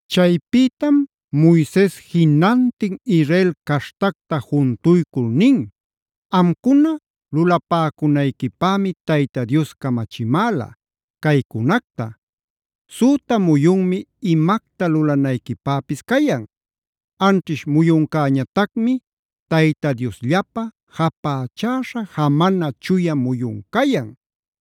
Chaypïtam Moises jinantin Israel caśhtacta juntuycul nin: “Amcuna lulapäcunayquipämi Tayta Dios camachimäla caycunacta: Süta muyunmi imacta lulanayquipäpis cayan. Anćhish muyuncäñatacmi Tayta Diosllapä japächäśha jamana chuya muyun cayan.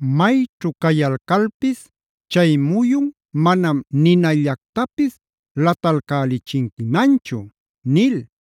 Mayćhu cayalcalpis chay muyun manam ninallactapis latalcälichinquimanchu” nil.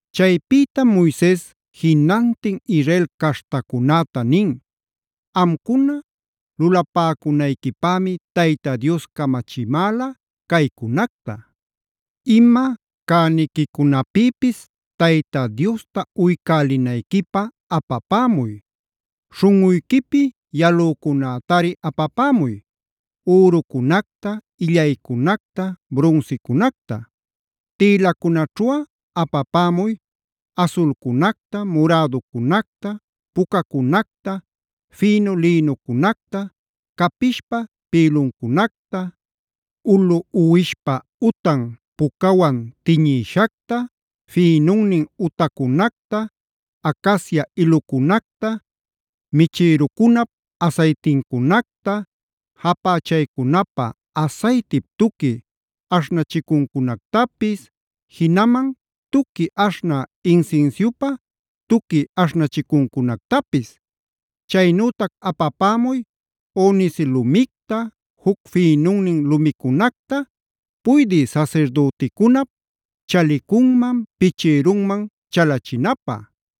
Chaypïtam Moises jinantin Israel caśhtacunäta nin: “Amcuna lulapäcunayquipämi Tayta Dios camachimäla caycunacta: Ima cäniquicunapïpis Tayta Diosta uycälinayquipä apapämuy. Śhunꞌuyquipi yalücunätari apapämuy: ürucunacta, illaycunacta, brunsicunacta. Tïlacunaćhuꞌa apapämuy: asulcunacta, muräducunacta, pucacunacta, fïnu lïnucunacta, capishpa pïluncunacta, ulu uwishpa utan pucawan tiñïshacta, fïnunnin utacunacta, acacia ilucunacta, michïrucunap asaytincunacta, japächaycunapä asaytip tuqui aśhnachicuncunactapis, jinaman tuqui aśhnä insinsiupä tuqui aśhnachicuncunactapis. Chaynütac apapämuy: onice lumicta, juc fïnunnin lumicunacta puydï sasirdüticunap chalicunman, pichïrunman chalachinapä.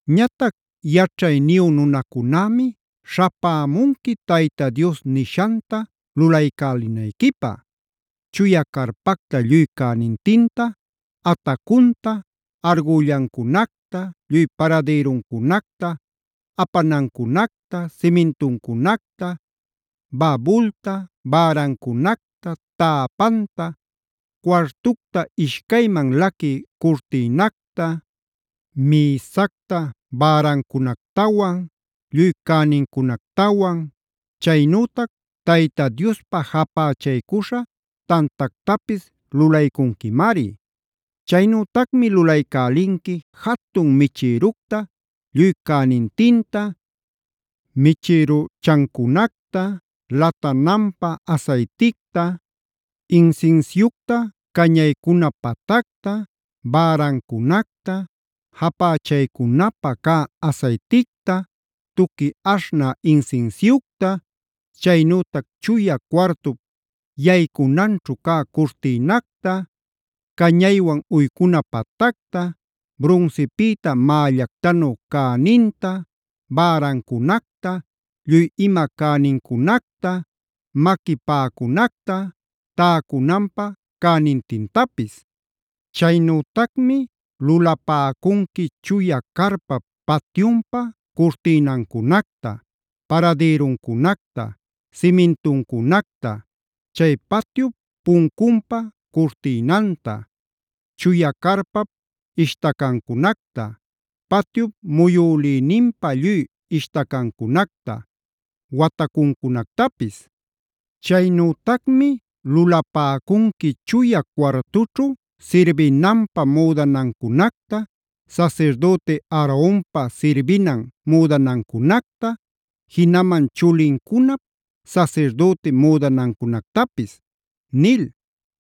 “Ñatac yaćhayniyu nunacunämi śhapämunqui Tayta Dios nishanta lulaycälinayquipä: Chuya carpacta lluy cänintinta: atacunta, argüllancunacta, lluy paradïruncunacta, apanancunacta, simintuncunacta, babulta bärancunacta, täpanta, cuartucta ishcayman laquï curtïnacta, mïsacta bärancunactawan, lluy cänincunactawan, chaynütac Tayta Diospä japächaycuśha tantactapis lulaycunquimari. Chaynütacmi lulaycälinqui jatun michïructa lluy cänintinta, michïruchancunacta, latananpä asayticta, insinsiucta cañaycuna patacta, bärancunacta, japächaycunapä cä asayticta, tuqui aśhnä insinsiucta, chaynütac chuya cuartup yaycunanćhu cä curtïnacta, cañaywan uycuna patacta, brunsipïta mällactanu cäninta, bärancunacta, lluy ima cänincunacta, maqui paꞌacunacta täcunanpä cänintintapis. Chaynütacmi lulapäcunqui chuya carpap patyunpa curtïnancunacta, paradïruncunacta, simintuncunacta, chay patyup puncunpä curtïnanta, chuya carpap ishtacancunacta, patyup muyülïninpä lluy ishtacacunacta, watacuncunactapis. Chaynütacmi lulapäcunqui chuya cuartućhu sirbinanpä müdanancunacta, sasirdüti Aaronpä sirbinan müdanancunacta, jinaman chulincunap sasirdüti müdanancunactapis” nil.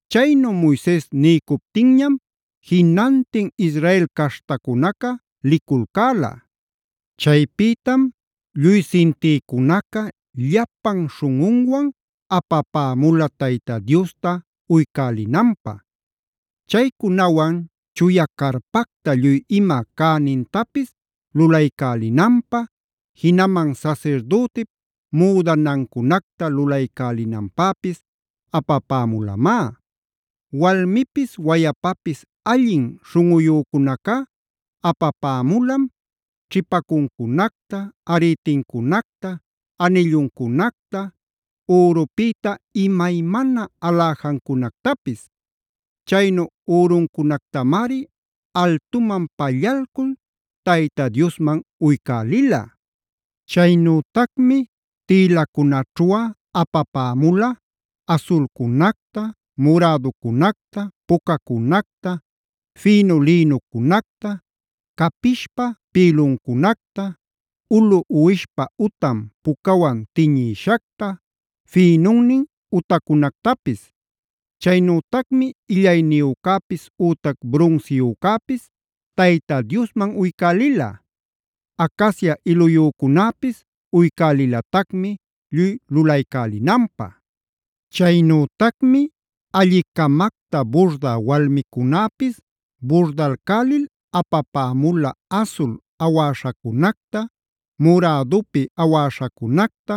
Chaynu Moises niycuptinñam jinantin Israel caśhtacunaca liculcäla. Chaypïtam lluy sintïcunaca, llapan śhunꞌunwan apapämula Tayta Diosta uycälinanpä. Chaycunawan chuya carpacta lluy ima cänintapis lulaycälinanpä, jinaman sasirdütip müdanancunacta lulaycälinanpäpis apapämulamá. Walmipis wayapapis allin śhunꞌuyücunacá apapämulam: ćhipacuncunacta, arïtincunacta, anilluncunacta, ürupïta imaymana aläjancunactapis. Chaynu üruncunactamari altuman pallalcul Tayta Diosman uycälila. Chaynütacmi tïlacunaćhuꞌa apapämula: asulcunacta, muräducunacta, pucacunacta, fïnu lïnucunacta, capishpa pïluncunacta, ulu uwishpa utan pucawan tiñïshacta, fïnunnin utacunactapis. Chaynütacmi illayniyücäpis ütac brunsiyücäpis Tayta Diosman uycälila. Acacia iluyücunäpis uycälilatacmi lluy lulaycälinanpä. Chaynütacmi alli-camacta burdä walmicunäpis burdalcälil apapämula asul awäśhacunacta, murädupi awäśhacunacta,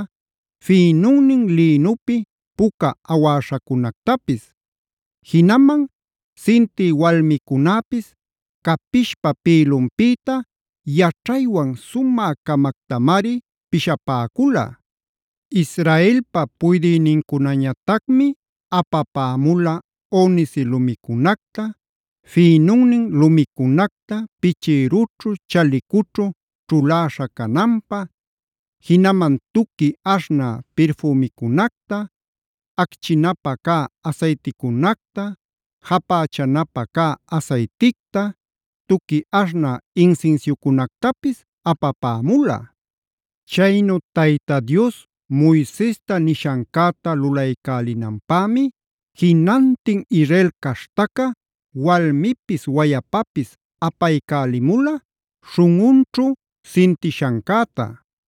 fïnunnin lïnupi puca awäśhacunactapis. Jinaman sintï walmicunäpis capishpa pïlunpïta yaćhaywan sumä-camactamari pishapäcula. Israelpa puydïnincunañatacmi apapämula onice lumicunacta, fïnunnin lumicunacta pichïrućhu chalicućhu ćhuläśha cananpä, jinaman tuqui aśhnä pirfümicunacta, acchinapä cä asayticunacta, japächanapä cä asayticta, tuqui aśhnä insinsiucunactapis apapämula. Chaynu Tayta Dios Moisesta nishancäta lulaycälinanpämi jinantin Israel caśhtaca walmipis wayapapis apaycälimula śhunꞌunćhu sintishancäta.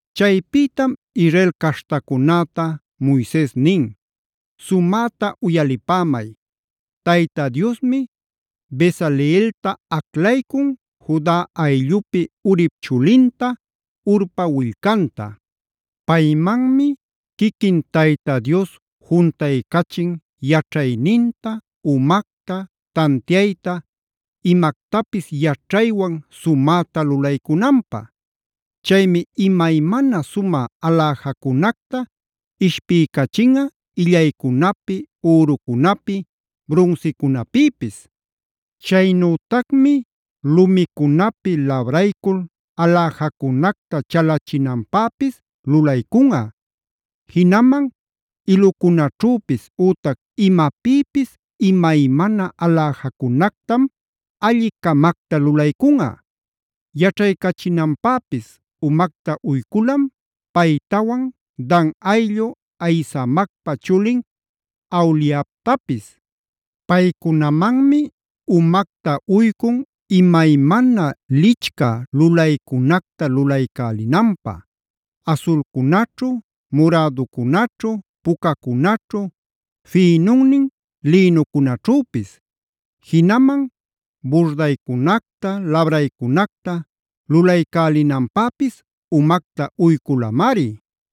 Chaypïtam Israel caśhtacunäta Moises nin: “Sumäta uyalipämay, Tayta Diosmi Bezaleelta aclaycun, Juda ayllupi Urip chulinta, Hurpa willcanta. Paymanmi quiquin Tayta Dios juntaycachin yaćhayninta, umacta, tantiayta, imactapis yaćhaywan sumäta lulaycunanpä. Chaymi imaymana sumä aläjacunacta ishpiycachinꞌa illaycunapi, ürucunapi, brunsicunapïpis. Chaynütacmi lumicunapi labraycul aläjacunacta chalachinanpäpis lulaycunꞌa. Jinaman ilucunaćhüpis, ütac imapïpis imaymana aläjacunactam alli-camacta lulaycunꞌa. Yaćhaycachinanpäpis umacta uyculam paytawan Dan ayllu Ahisamacpa chulin Aholiabtapis. Paycunamanmi umacta uycun imaymana lichcä lulaycunacta lulaycälinanpä: asulcunaćhu, muräducunaćhu, pucacunaćhu, fïnunnin lïnucunaćhüpis. Jinaman burdaycunacta, labraycunacta lulaycälinanpäpis umacta uyculamari.